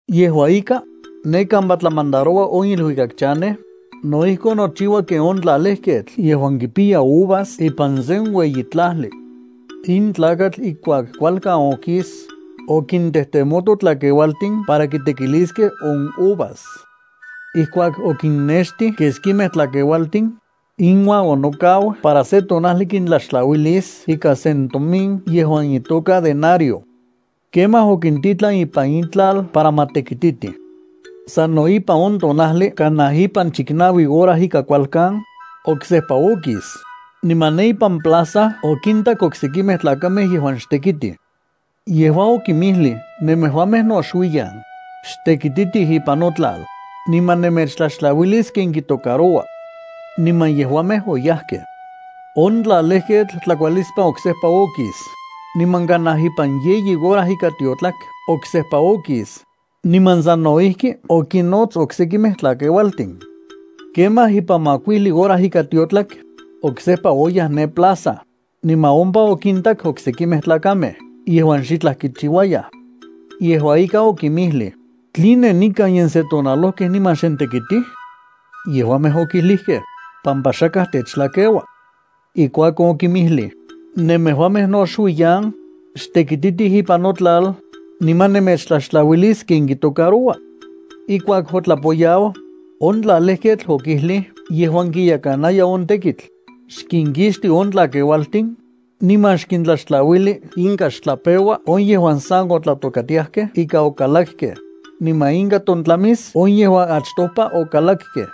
’Yejua ika, ne kampa tlamandaroua on iluikak chanej, no ijkon nochiua ken on tlalejketl yejuan kipiya uvas ipan sen ueyi tlajli. In tlakatl ijkuak kualkan okis, okintejtemoto tlakeualtin para kitekiliskej on uvas. Ijkuak okinnextij keskimej tlakeualtin, inuan onokau para se tonajli kintlaxtlauilis ikan sen tomin yejuan itoka denario. Kemaj okintitlan ipan itlal para ma tekititij. Sano ipan on tonajli kanaj ipan chiknaui hora ika kualkan, oksejpa okis, niman ne ipan plaza okintak oksekimej tlakamej yejuan xtekitij. Yejua okinmijlij: “Nemejuamej no xuiyan, xtekititij ipan notlal, niman nemechtlaxtlauilis ken kitocaroua.” Niman yejuamej oyajkej. On tlalejketl tlakualispan oksejpa okis, niman kanaj ipan yeyi hora ika tiotlak oksejpa okis, niman sano ijki okinnots oksekimej tlakeualtin. Kemaj ipan makuijli hora ika tiotlak, oksejpa oyaj ne plaza, niman ompa okintak oksekimej tlakamej yejuan xitlaj kichiuayaj. Yejua ika okinmijlij: “¿Tline nikan yonensetonalojkej niman xnentekitij?” Yejuamej okijlijkej: “Pampa xakaj techtlakeua.” Ijkuakon okinmijlij: “Nemejuamej no xuiyan, xtekititij ipan notlal, niman nemechtlaxtlauilis ken kitocaroua.” ’Ijkuak otlapoyau, on tlalejketl okijlij yejuan kiyekanaya on tekitl: “Xkinkixti on tlakeualtin, niman xkintlaxtlauili inka xtlapeua on yejuan sa otlatokatiajkej ika okalakkej, niman inka tontlamis on yejuan achtopa okalakkej.”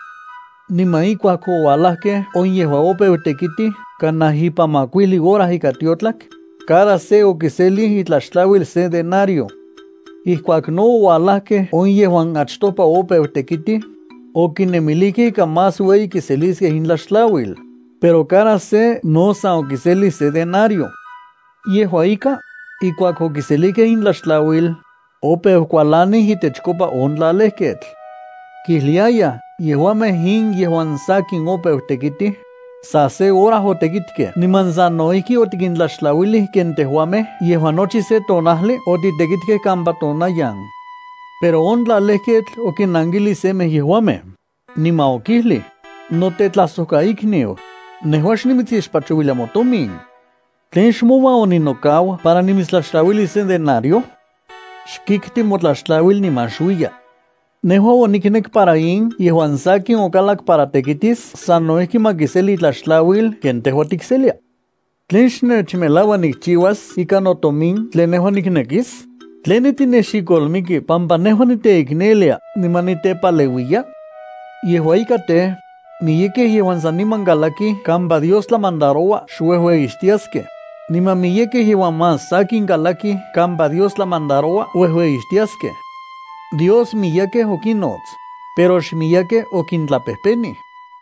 Niman ijkuak oualajkej on yejuan opeu tekitij kanaj ipan makuijli hora ika tiotlak, cada se okiselij itlaxtlauil se denario. Ijkuak no oualajkej on yejuan achtopa opeu tekitij, okinemilijkej ika más ueyi kiseliskej intlaxtlauil, pero cada se no san okiselij se denario. Yejua ika, ijkuak okiselijkej intlaxtlauil, opeu kualanij itechkopa on tlalejketl. Kijliayaj: “Yejuamej in yejuan sakin opeu tekitij, sa se hora otekitkej niman sano ijki otikintlaxtlauilij ken tejuamej yejuan nochi se tonajli otitekitkej kampa tonayan.” Pero on tlalejketl okinankilij semej yejuamej, niman okijlij: “Notetlajsojkaikniu, nejua xnimitsixpachouilia motomin. ¿Tlen xmouan oninokau para nimitstlaxtlauilis se denario? Xkikti motlaxtlauil niman xuiya. Nejua oniknek para in yejuan sakin okalak para tekitis sano ijki ma kiseli itlaxtlauil ken tejua tikselia. ¿Tlen xnechmelaua nikchiuas ikan notomin tlen nejua niknekis? ¿Tline tinexikolmiki pampa nejua niteiknelia niman nitepaleuiya?” ’Yejua ika tej, miyekej yejuan saniman kalakij kampa Dios tlamandaroua xuejueyixtiaskej, niman miyekej yejuan más sakin kalakij kampa Dios tlamandaroua uejueyixtiaskej. Dios miyekej okinnots, pero xmiyekej okintlapejpenij.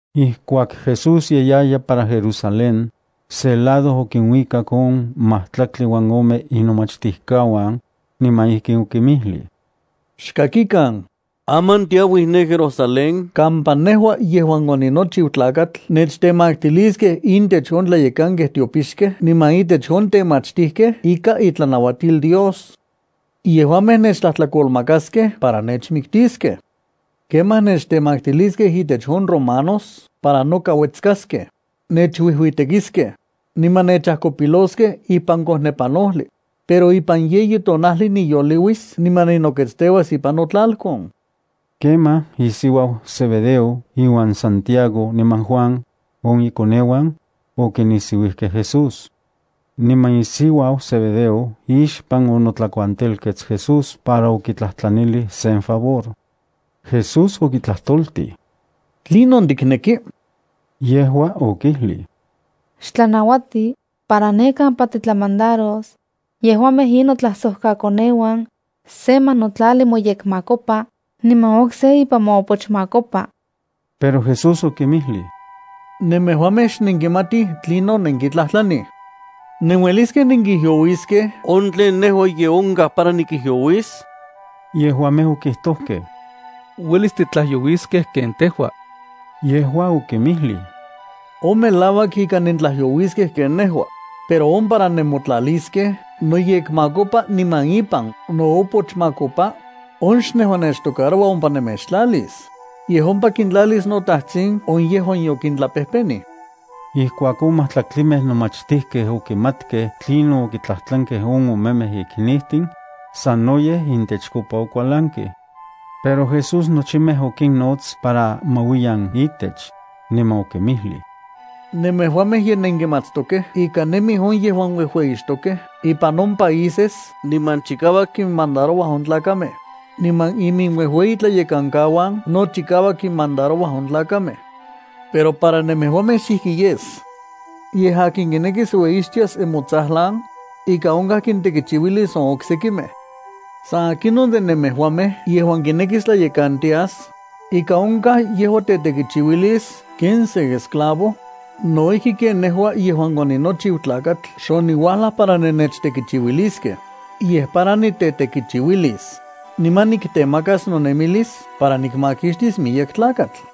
Ijkuak Jesús ye yaya para Jerusalén, se lado okinuikak on majtlaktli uan ome inomachtijkauan, niman ijkin okinmijlij: —Xkakikan, aman tiauij ne Jerusalén kampa nejua yejuan oninochiu Tlakatl nechtemaktiliskej intech on tlayekankej tiopixkej niman intech on temachtijkej ikan itlanauatil Dios. Yejuamej nechtlajtlakolmakaskej para nechmiktiskej. Kemaj nechtemaktiliskej intech on romanos para noka uetskaskej, nechuijuitekiskej, niman nechajkopiloskej ipan kojnepanojli, pero ipan yeyi tonajli niyoliuis niman ninoketsteuas ipan notlalkon. Kemaj, isiuau Zebedeo iuan Santiago niman Juan, on ikoneuan, okinisiuijkej Jesús. Niman isiuau Zebedeo ixpan onotlakuantelkets Jesús para okitlajtlanilij sen favor. Jesús okitlajtoltij: —¿Tlinon tikneki? Yejua okijlij: —Xtlanauati para ne kampa titlamandaros yejuamej in notlajsojkakoneuan se ma notlali moyekmakopa niman okse ipan moopochmakopa. Pero Jesús okinmijlij: —Nemejuamej xnenkimatij tlinon nenkitlajtlanij. ¿Nenueliskej nenkijyouiskej on tlen nejua ye onkaj para nikijyouis? Yejuamej okijtojkej: —Uelis titlajyouiskej ken tejua. Yejua okinmijlij: —On melauak ika nentlajyouiskej ken nejua, pero on para nemotlaliskej noyekmakopa niman ipan noopochmakopa, on xnejua nechtocaroua ompa nemechtlalis, yej ompa kintlalis noTajtsin on yejuan yokintlapejpenij. Ijkuak on majtlaktlimej nomachtijkej okimatkej tlinon okitlajtlankej on omemej iknijtin, sanoyej intechkopa okualankej. Pero Jesús nochimej okinnots para ma uiyan itech, niman okinmijlij: —Nemejuamej ye nenkimatstokej ika nemij on yejuan uejueyixtokej ipan on países nimanchikauak kinmandarouaj on tlakamej, niman iminuejueyitlayekankauan no chikauak kinmandarouaj on tlakamej. Pero para nemejuamej xijki yes. Yej akin kinekis ueyixtias nemotsajlan, ika onkaj kintekichiuilis on oksekimej. San akinon de nemejuamej yejuan kinekis tlayekantias, ika onkaj yejua tetekichiuilis ken sen esclavo, no ijki ken nejua yejuan oninochiu Tlakatl xoniuajlaj para nechtekichiuiliskej, yej para nitetekichiuilis, niman niktemakas nonemilis para nikmakixtis miyek tlakatl.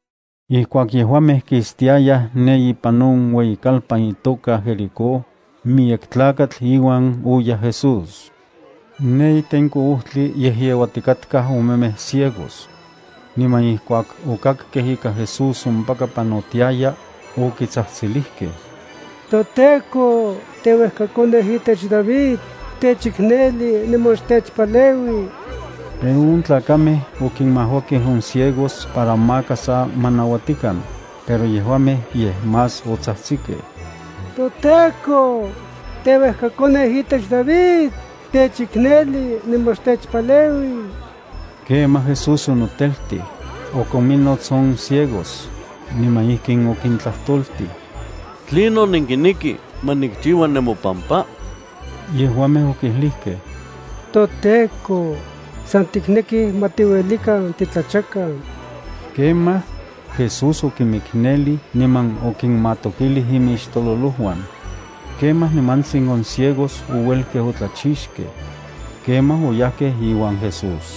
Ijkuak yejuamej kistiayaj ne ipan on ueyikalpan itoka Jericó, miyek tlakatl iuan oyaj Jesús. Ne itenko ojtli yejyeuatikatkaj omemej ciegos. Niman ijkuak okakkej ika Jesús ompaka panotiaya, okitsajtsilijkej: —¡ToTEKO teuejkakoneu itech David, xtechikneli niman xtechpaleui! Pero on tlakamej okimajuakej on ciegos para maka sa ma nauatikan, pero yejuamej yej más otsajtsikej: —¡ToTEKO, teuejkakoneu itech David, xtechikneli niman xtechpaleui! Kemaj Jesús onoteltij, okominnots on ciegos, niman ijkin okintlajtoltij: —¿Tlinon nenkinekij ma nikchiua nemopampa? Yejuamej okijlijkej: —ToTEKO, san tiknekij ma tiuelikan titlachakan. Kemaj, Jesús okimiknelij niman okinmatokilij imixtololojuan. Kemaj nimantsin on ciegos ouelkej otlachixkej. Kemaj oyajkej iuan Jesús.